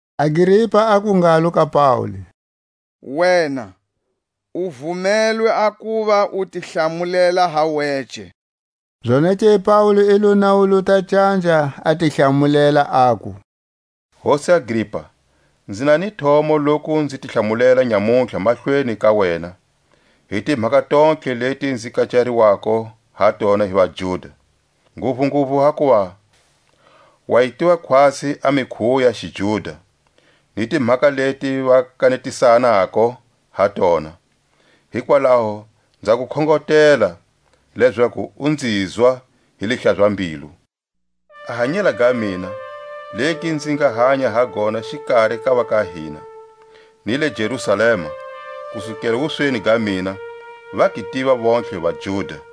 Agripa aku ngalo ka Paule: Wena u vumelwe a kuva u ti hlamulela ba wece. Zonake Paule i lo nawuluta canja, a ti hlamulela, aku: Hosi Agripa, nzi na ni thomo loku nzi ti hlamulela nyamutlha mahlweni ka wena, hi timhaka tontlhe leti nzi kecariwako ha tona hi vaJuda. Nguvunguvu hakuva wa yi tiva khwatsi a mikhuwo ya xijuda, ni timhaka leti va kanetisanako ha tona: hikwalaho nza ku khongotela lezaku u nzizwa hi lihlaza-mbilu. A hanyela ga mina, legi nzi nga hanya ha gona xikari ka va ka hina, ni le Jerusalema, kusukela wusweni ga mina, va gi tiva vontlhe vaJuda.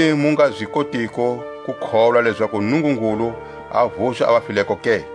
Hikuyini mu nga zi kotiko ku kholwa lezaku Nungungulu a vuxa a vafileko ke?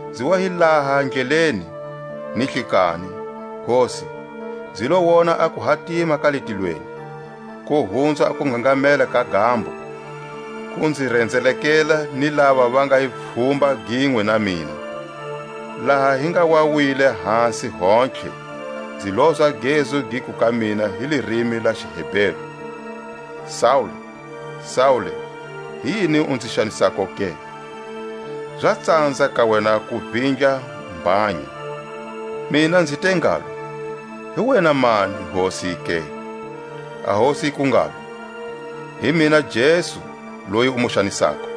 Nzi wa hi laha ndleleni ni hlikanhi, Hosi, nzi lo wona a kuhatima ka le tilweni, ko hunza a kungangamela ka gambo, ku nzi renzelekela ni lava va nga hi pfhumba ginwe na mina. Laha hi nga wa wile hasi hontlhe, nzi lozwa a gezu giku ka mina hi lirimi la xiHeberu: Saule, Saule, hi yini u nzi xanisako ke? Za tsanza ka wena ku vindla mbhanya. Mina nzi te ngalo; Hi wena mani, Hosi, ke? A Hosi yiku ngalo: Hi mina Jesu loyi u mu xanisako.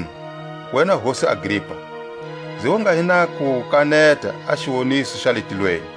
Makunu, wena hosi Agripa, nzi wa nga hi na ku kaneta a xiwoniso xa le tilweni;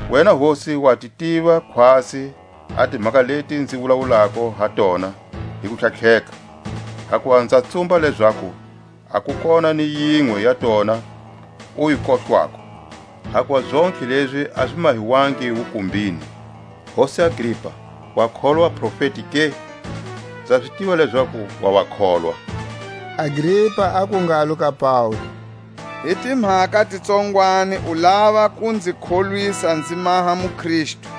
Wena hosi wa ti tiva khwatsi a timhaka leti nzi wulawulako ha tona hi kutlhatlheka; hakuva nza tsumba lezaku a ku kona ni yinwe ya tona u yi kohlwako; hakuva zontlhe lezi a zi mahiwangi wukumbini. Hosi Agripa, wa kholwa vaprofeti ke? Nza zi tiva lezaku wa va kholwa. Agripa aku ngalo ka Paule: Hi timhaka ti tsongwani u lava ku nzi kholwisa nzi maha muKristu.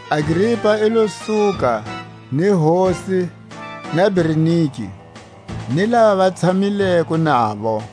Agripa i lo suka, ni hosi, na Bernike, ni lava va tshamileko navo.